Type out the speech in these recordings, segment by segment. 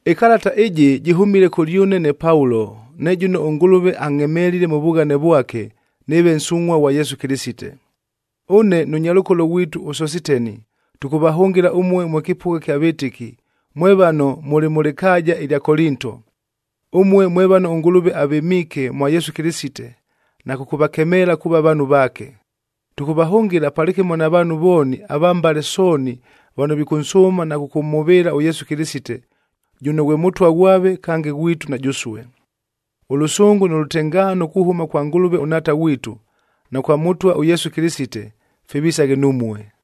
Ɨkalata ɨjɨ jɨhʉmile kʉlyʉne ne Paulo, ne jʉno ʉNgʉlʉve angʼhemelile mʉ vughane vwake nɨɨve nsungʼhua ghwa Yesu Kɨlɨsite. Ʉne nʉ nyalʉkolo ghwitu ʉSositeni, tʉkʉvahʉngɨla ʉmue mwe kɨpʉgha kya vɨtɨki, mwe vano mʉlɨ mʉ lɨkaaja ɨlya Kolinto, ʉmue mwe vano ʉNgʉlʉve avɨmiike mwa Yesu Kɨlɨsite na kʉkʉvakemeela kuuva vaanhu vaake. Tʉkʉvahʉngɨla palɨkɨmo na vaanhu vooni ava mbale sooni vano vikʉnsʉʉma na kʉkʉmhʉvɨɨla ʉYesu Kɨlɨsite, jʉno ghwe Mʉtwa ghwave kange ghwitu na jʉsue. Ʉlʉsʉngʉ nʉ lʉtengaano kuhʉma kwa Ngʉlʉve ʉNhaata ghwitu, na kwa Mʉtwa ʉYesu Kɨlɨsite, fivisaghe numue.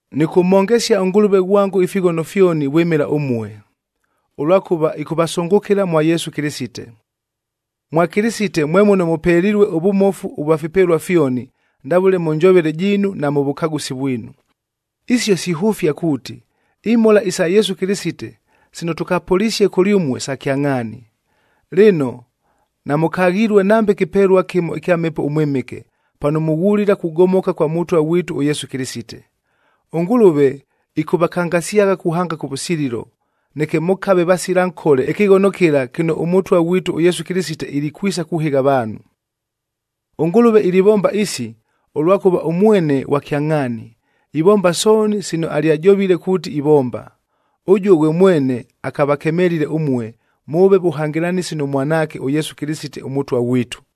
Nɨkʉmhongesia ʉNgʉlʉve ghwango ifighono fyoni vwɨmɨla ʉmue, ʉlwakʉva ɨkʉvasʉngʉkɨla mwa Yesu Kɨlɨsite. Mwa Kɨlɨsite mwe muno mʉpelilue ʉvʉmofu ʉvwa fipelua fyoni, ndavʉle mʉ njovele jiinu na mʉ vʉkagʉsi vwinu. Isio sihʉfia kuuti, imhola isa Yesu Kɨlɨsite sino tʉkapʉlisie kʉlyʉmue sa kyangʼhaani. Lɨno, namʉkaghilue nambe kɨpelua kɨmo ɨkya Mhepo ʉMwɨmɨke, pano mughulila kugomoka kwa Mʉtwa ghwitu ʉYesu Kɨlɨsite. ɄNgʉlʉve ɨkʉvakangasyagha kuhanga kʉvʉsililo, neke mʉkave vasila nkole ɨkɨghono kɨla kɨno ʉMʉtwa ghwitu ʉYesu Kɨlɨsite ilikwisa kuhɨgha avaanhu. ɄNgʉlʉve ilivomba isi, ʉlwakʉva ʉmwene ghwa kyangʼhaani, ivomba sooni sino alyajovile kuuti ivomba. Ʉjuo ghwe mwene akavakemelile ʉmue, mʉʉve vʉhangɨlanɨsi nʉ Mwanaake ʉYesu Kɨlɨsite ʉMʉtwa ghwitu.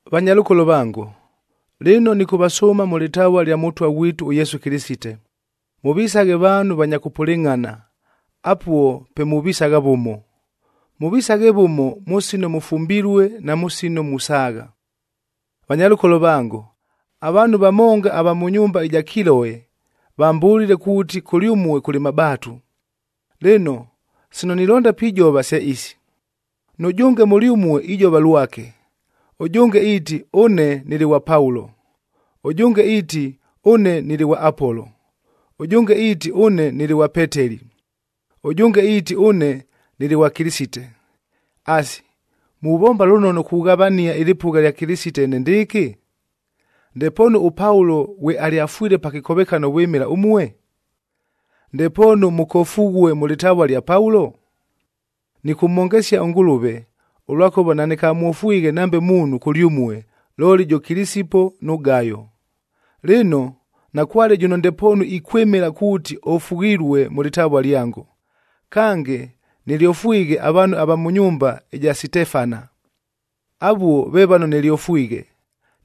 Vanyalʉkolo vango, lɨno nɨkʉvasʉʉma mʉ lɨtavua lya Mʉtwa ghwitu ʉYesu Kɨlɨsite, mʉvisaghe vaanhu vanya kʉpʉlɨngʼhana, apuo pe muvisagha vʉmo. Mʉvisaghe vʉmo mʉ sino mʉfumbilue na mʉ sino musaagha. Vanyalʉkolo vango, avaanhu vamonga ava mʉ nyumba ɨja Kiloe vambʉlile kuuti kʉlyʉmue kʉlɨ mabaatu. Lɨno, sino nilonda pijova se isi: nʉjʉnge mʉlyʉmue ijova lwake, ʉjʉnge iiti, “Ʉne, nɨlɨ ghwa Paulo.” Ʉjʉnge iiti, “Ʉne, nɨlɨ ghwa Apolo.” Ʉjʉnge iiti, “Ʉne, nɨlɨ ghwa Peteli.”a Ʉjʉnge iiti, “Ʉne, nɨlɨ ghwa Kɨlɨsite.” Asi, muvomba lʉnono kughavania ɨlɨpʉgha lya Kɨlɨsite enendɨɨkɨ? Ndepoonu ʉPaulo ghwe alyafwile pa kɨkovekano vwɨmɨla ʉmue? Ndepoonu mʉkofughue mʉ lɨtavua lya Paulo? Nɨkʉmhongesia ʉNgʉlʉve, ʉlwakʉva nanɨkamwofwighe nambe muunhu kʉlyʉmue, looli jʉ Kilisipo nʉ Gayo. Lɨno, nakwale jʉno ndepoonu ikwɨmɨla kuuti ofughilue mʉ lɨtavua lyango. Kange, nɨlyofwighe avaanhu ava mʉ nyumba ɨja Sitefana. Avuo ve vano nɨlyofwighe,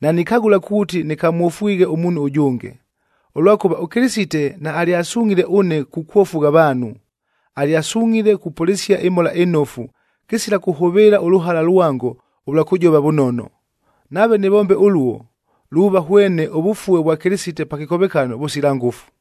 nanikagʉla kuuti nɨkamwofwighe ʉmuunhu ʉjʉnge. Ʉlwakʉva, ʉKɨlɨsite naalyasungʼhile ʉne kukwofugha avaanhu. Alyasungʼhile kupʉlɨsia ɨMhola ɨNofu, kɨsila kʉhʉvɨɨla ʉlʉhala lwango ʉlwa kʉjova vʉnono. Nave nɨvombe ʉluo, luuva hwene ʉvʉfue vwa Kɨlɨsite pa kɨkovekano vʉsila ngʉfu.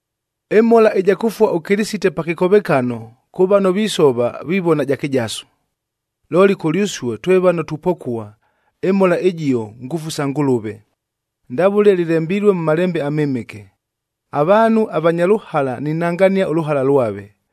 Ɨmhola ɨja kʉfua ʉKɨlɨsite pa kɨkovekano kʉ vano visova vivona ja kɨjasu, looli kʉlyʉsue twe vano tupokua, ɨmhola ɨjio ngʉfu sa Ngʉlʉve. Ndavʉle lɨlembilue mʉ Malembe aMɨmɨke, “Avaanhu avanya lʉhala ninangania ʉlʉhala lwave,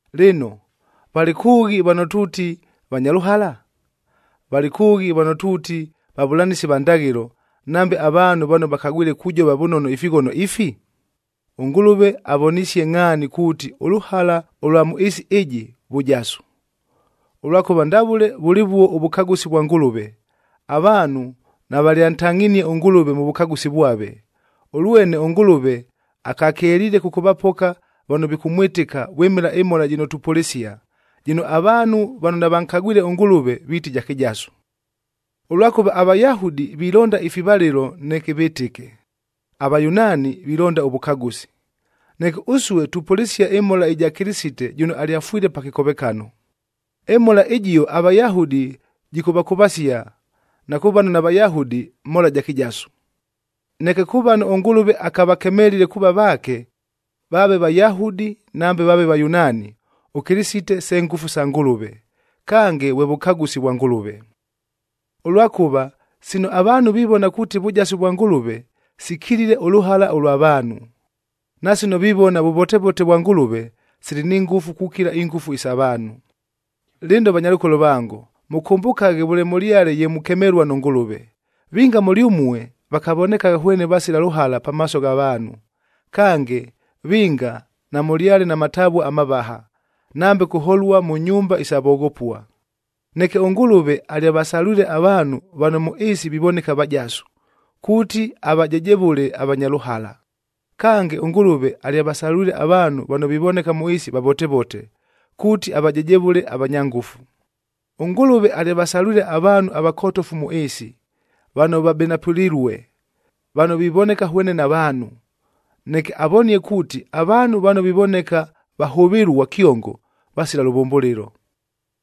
Lɨno, valɨ kʉʉghi vano tuuti vanya lʉhala? Valɨ kʉʉghi vano tuuti vavʉlanɨsi va ndaghɨlo, nambe avaanhu vano vakagwile kujova vʉnono ifighono ifi? ɄNgʉlʉve avonisie ngʼhaani kuuti ʉlʉhala ʉlwa mʉ ɨɨsi ɨjɨ, vʉjasu. Ʉlwakʉva ndavʉle vʉlɨvuo ʉvʉkagʉsi vwa Ngʉlʉve, avaanhu navalyantangʼhinie ʉNgʉlʉve mʉ vʉkagʉsi vwave. Ʉlwene ʉNgʉlʉve akakeliile kʉkʉvapoka vano vikʉmwɨtɨka vwɨmɨla ɨmhola jɨno tupʉlɨsia, jɨno avaanhu vano navankagwile ʉNgʉlʉve viiti ja kɨjasu. Ʉlwakʉva aVayahudi vilonda ifivalɨlo neke vɨtɨke, aVayunaani vilonda ʉvʉkagʉsi. Neke ʉsue, tupʉlɨsia ɨmhola ɨja Kɨlɨsite jʉno alyafwile pa kɨkovekano. Ɨmhola ɨjio aVayahudi jɨkʉvakʉvasia, na kʉ vano naVayahudi mhola ja kɨjasu. Neke kʉ vano ʉNgʉlʉve akavakemelile kuuva vaake, vaave Vayahudi nambe vaave Vayunaani, ʉKɨlɨsite se ngʉfu sa Ngʉlʉve, kange vwe vʉkagʉsi vwa Ngʉlʉve. Ʉlwakʉva, sino avaanhu vivona kuuti vʉjasu vwa Ngʉlʉve, sikilile ʉlʉhala ʉlwa vaanhu. Na sino vivona vʉvotevote vwa Ngʉlʉve, sili ni ngʉfu kukila ingʉfu isa vaanhu. Lɨno vanyalʉkolo vango, mʉkʉmbʉkaghe vʉle mʉlyale ye mukemelua nʉ Ngʉlʉve. Vinga mʉlyʉmue vakavonekagha hwene vasila lʉhala pamaaso gha vaanhu. Kange, vinga namʉlyale na matavua amavaha, nambe kuholua mʉ nyumba isa voghopua. Neke ʉNgʉlʉve alyavasalwile avaanhu vano mʉ ɨɨsi vivoneka vajasu, kuuti avajejevʉle avanya lʉhala. Kange, ʉNgʉlʉve alyavasalwile avaanhu vano vivoneka mʉ ɨɨsi vavotevote, kuuti avajejevʉle avanya ngʉfu. ɄNgʉlʉve alyavasalwile avaanhu avakotofu mʉ ɨɨsi, vano vabenapʉlilue, vano vivoneka hwene navaanhu, neke avonie kuuti, avaanhu vano vivoneka vahʉvɨlua kyongo, vasila lʉvʉmbʉlɨlo.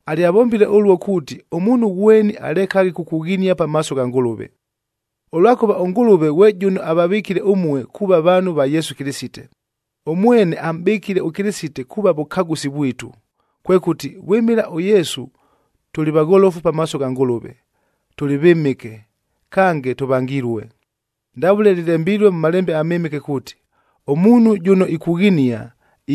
Alyavombile ʉluo kuuti ʉmuunhu ghweni alekaghe kukughinia pamaaso gha Ngʉlʉve. Ʉlwakʉva ʉNgʉlʉve ghwe jʉno avavɨkile ʉmue kuuva vaanhu va Yesu Kɨlɨsite. Ʉmwene amʼbɨkile ʉKɨlɨsite kuuva vʉkagʉsi vwitu. Kwekʉti, vwɨmɨla ʉYesu tʉlɨ vagholofu pamaaso gha Ngʉlʉve, tʉlɨ vɨmɨke, kange tʉvangilue. Ndavʉle lɨlembilue mʉ Malembe aMɨmɨke kuuti, “Ʉmuunhu jʉno ikughinia,